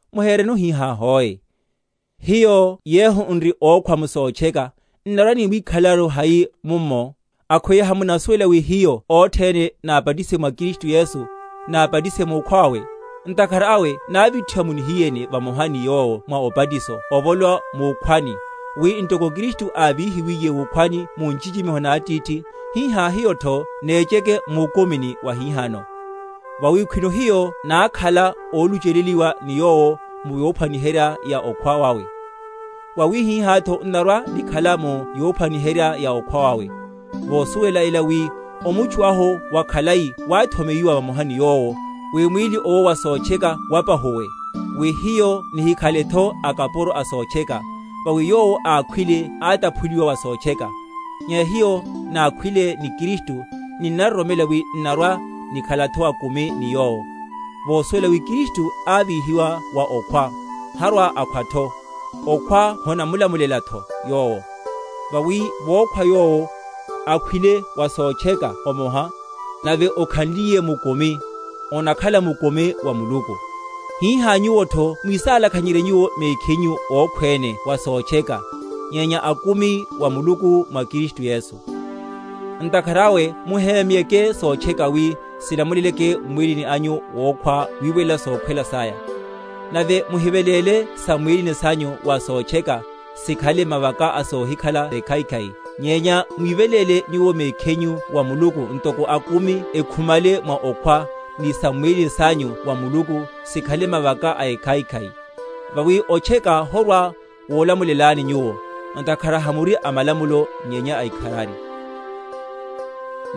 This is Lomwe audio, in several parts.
Muhereno hihá hoe. Hiyo yehu n’ri ókhwa m’sotcheka, n’narwa‐nimwíkhalelaru hai mummo? Akhweya hamunasuwela wi hiyo othene nábatisiwe mwa Kristu Yesu, nábatisiwe mukhwa wawe? Ntakhara awe návithiwa mu nihiyeni vamoha ni Yowo mwa obatiso ovolowa mukhwani; wi ntoko Kristu ávíhiwiye wukhwani mu nchichimiho na Atithi, hihá hiyotho nécheke mukumini wahihano. Vawi khwino hiyo nákhala óluchelelihiwa ni Yowo mu yophwaniherya ya okhwa wawe, wawihihátho n’narwa‐nikhala mu yophwaniherya ya okhwa wawe; vosuwela ela, wi omutchu ahu wakhalai wáthomeyiwa vamoha ni Yowo, wi mwíli owo wa sotcheka wapahuwe, wi hiyo nihikhaletho akapuro a sotcheka; vawi yowo ákhwile átaphuliwa wa sotcheka. Nyenya hiyo nákhwile ni Kristu, ninnaroromela wi n’narwa‐nikhalatho akumi ni Yowo; vosuwela wi Kristu ávíhiwa wa okhwa, harwa‐akhwatho; okhwa honamulamulelatho Yowo. Vawi vokhwa Yowo, akhwile wa sotcheka omoha; nave okhanliye mukumi, onakhala mukumi wa Muluku. Hihá nyuwotho mwísálakhanyerye nyuwo mekhinyu ókhwene wa sotcheka, nyenya akumi wa Muluku mwa Kristu Yesu. Ntakhara awe muhémyeke sotcheka wi silamuleleke m’mwíli anyu wokhwa wiwelela sokhwela saya: nave muhiveléle sam’mwílini sanyu wa sotcheka, sikhale mavaka a sohikhala ekhaikhai; nyenya mwíveléle nyuwo mekhinyu wa Muluku, ntoko akumi ekhumale mwa okhwa, ni sam’mwílini sanyu wa Muluku sikhale mavaka a ekhaikhai. Vawi otcheka horwa‐wolamulelani nyuwo; ntakhara hamuri a malamulo nyenya a ikharari. Hiyo na akapuro a Muluku.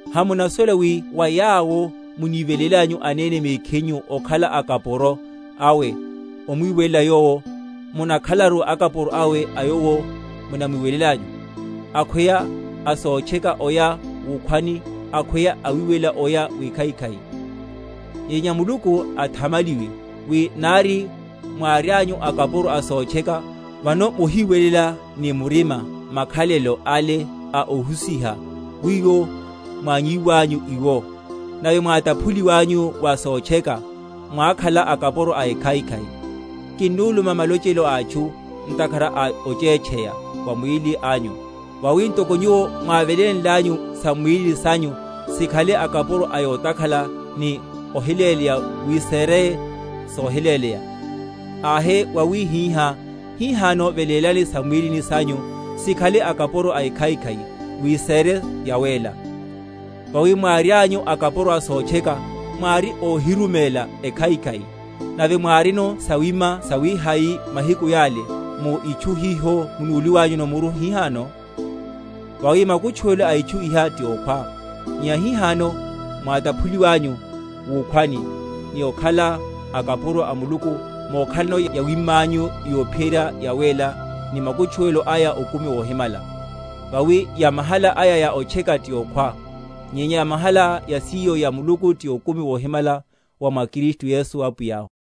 Hamunasuwela wi wa yawo munivelélanyu anene mekhinyu okhala akapuro awe omwiwelela yowo, munnakhalaru akapuro awe a yowo munamwiwelelanyu; akhweya a sotcheka oya wukhwani, akhweya awiwelela oya wikhaikhai? Nyenya Muluku athamaliwe, wi nari mwárianyu akapuro a sotcheka, vano mohiwelela ni murima makhalelo ale a ohusiha wiwo mwannyiwanyu iwo; nave mwátaphuliwanyu wa sotcheka, mwákhala akapuro a ekhaikhai. Kinuluma malochelo a atchu, ntakhara a ochétcheya wa mwíli anyu; vawi ntoko nyuwo mwávelénlanyu sam’mwílini sanyu sikhale akapuro a yotakhala ni ohiléleya wi sére sohiléleya, ahe wawihihá hihano velélani sam’mwílini sanyu sikhale akapuro a ekhaikhai wi sére yawéla. Vawi mwárianyu akapuro a sotcheka, mwári óhiruméla ekhaikhai. Nave mwárino sawima sawihai mahiku yale, mu itchu hiho munúliwanyuno muru hihano? Vawi makutchuwelo a itchu iha ti okhwa. Nyenya hihano, mwátaphuliwanyu wukhwani, ni okhala akapuro a Muluku, mokhalano yawimanyu yophiyerya yawéla, ni makutchuwelo aya okumi wohimala. Vawi yamahala aya ya otcheka ti okhwa; nyenya yamahala yasiyo ya Muluku ti okumi wohimala wa mwa Kristu Yesu Apwiyahu.